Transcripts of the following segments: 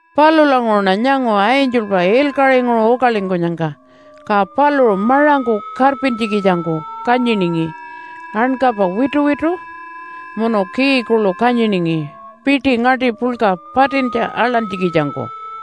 Palulanguṟuṉa nyangu angelpa ilkaṟinguṟu ukalingkunyangka, ka paluṟu maṟangku karpintjikitjangku kanyiningi ankapa wituwitu munu key kuḻu kanyiningi piṯi ngaṯi puḻka patintja aḻantjikitjangku.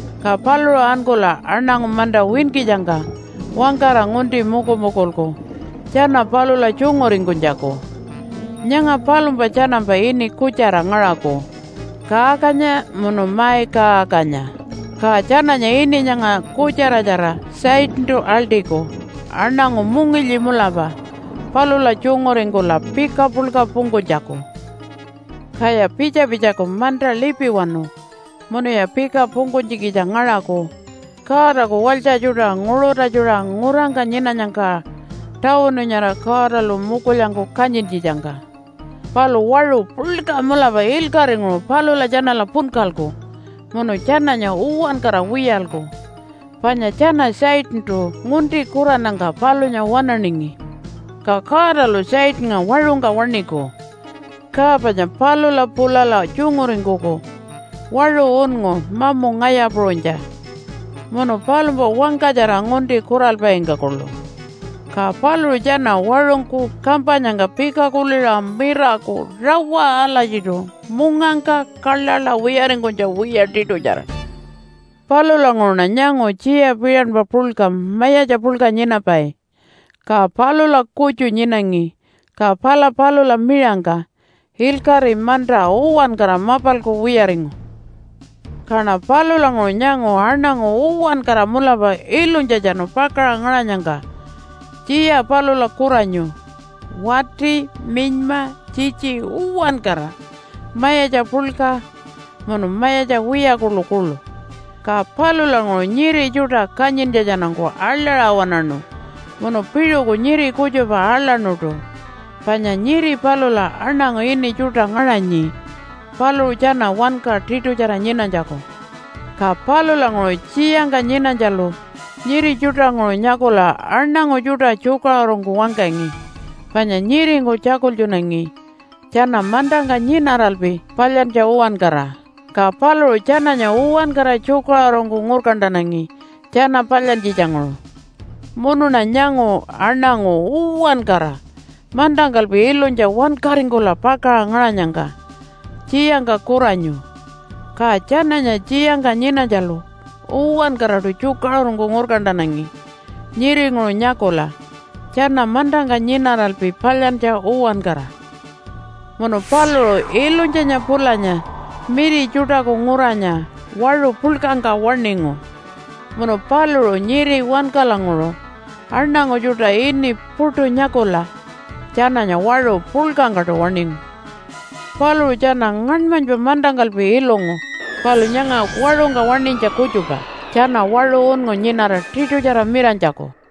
Ka paluṟu ankula aṉangu manta winkitjangka wangkara ngunti mukumukulku tjana palula tjunguringkunytjaku. Nyanga palumpa tjanampa ini kutjara ngaṟaku Kaakanya munu Maikaakanya, ka tjananya ini nyanga kutjaratjara Satantu aḻṯiku aṉangu mungilyi mulapa palula tjunguringkula pika puḻka pungkunytjaku. Kaya pitja-pitjaku manta lipiwanu munuya pika pungkunytjikitja ngaṟaku Godaku walytja tjuṯa nguṟutatjuṟa ngurangka nyinanyangka tawunu nyara Godalu mukulyangku kanyintjitjangka. Palu waṟu puḻka mulapa ilkaṟinguṟu palula tjanala punkalku munu tjananya uwankara wiyalku, panya tjana Satantu ngunti kurannyangka palunya waṉaningi. Ka Godalu Satannga waṟungka waṉiku, ka panya palula pulala tjunguringkuku waṟu unngu mamu ngaya puṟunytja munu palumpa wangkatjara ngunti kuralpaingka kuḻu. Ka paluṟu tjana waṟungku kampanyangka pika kuliṟa miraku rawa alatjiṯu mungangka kaḻaḻa wiyaringkunytja wiya tiṯutjara. Palulanguṟuṉa nyangu tjiya piṟanpa puḻka mayatja puḻka nyinapai. Ka palula kutju nyinangi. Ka pala palula miṟangka ilkaṟi, manta, uwankara mapalku wiyaringu. Kaṉa palulanguṟu nyangu aṉangu uwankara mulapa ilunytjatjanu pakaṟa ngaṟanyangka tjiya palula kuranyu, wati, minyma, tjitji uwankara mayatja puḻka munu mayatja wiya kuḻukuḻu. Ka palulanguṟu nyiri tjuṯa kanyintjatjanungku aḻaṟa waṉaṉu munu piṟuku nyiri kutjupa aḻaṉuṯu panya nyiri palula aṉangu ini tjuṯa ngaṟanyi paluṟu tjana wanka tiṯutjara nyinanytjaku. Ka palulanguṟu tjiyangka nyinanytjalu nyiri tjuṯanguṟu nyakula aṉangu tjuṯa tjukaṟurungku wangkangi panya nyiringku tjakultjunangi tjana mantangka nyinaralpi palyantja uwankara. Ka paluṟu tjananya uwankara tjukaṟurungku ngurkantanangi tjana palyantjitjanguṟu. Munuṉa nyangu aṉangu uwankara mantangkalpi ilunytja wankaringkula pakaṟa ngaṟanyangka tjiyangka kuranyu. Ka tjananya tjiyangka nyinanytjalu uwankaraṯu tjukaṟurungku ngurkantanangi nyiringuṟu nyakula tjana mantangka nyinaralpi palyantja uwankara. Munu paluṟu Ilunytjanya pulanya Miri Tjuṯaku Nguranya waṟu puḻkangka waṉingu. Munu paluṟu nyiri wankalanguṟu aṉangu tjuṯa ini puṯu nyakula tjananya waṟu puḻkangkaṯu waṉingu. Paluṟu tjana ngaṉmanypa mantangkalpi ilungu palu nyanga waṟungka waṉinytja kutjupa tjana waṟu unngu nyinara tiṯutjara miranytjaku.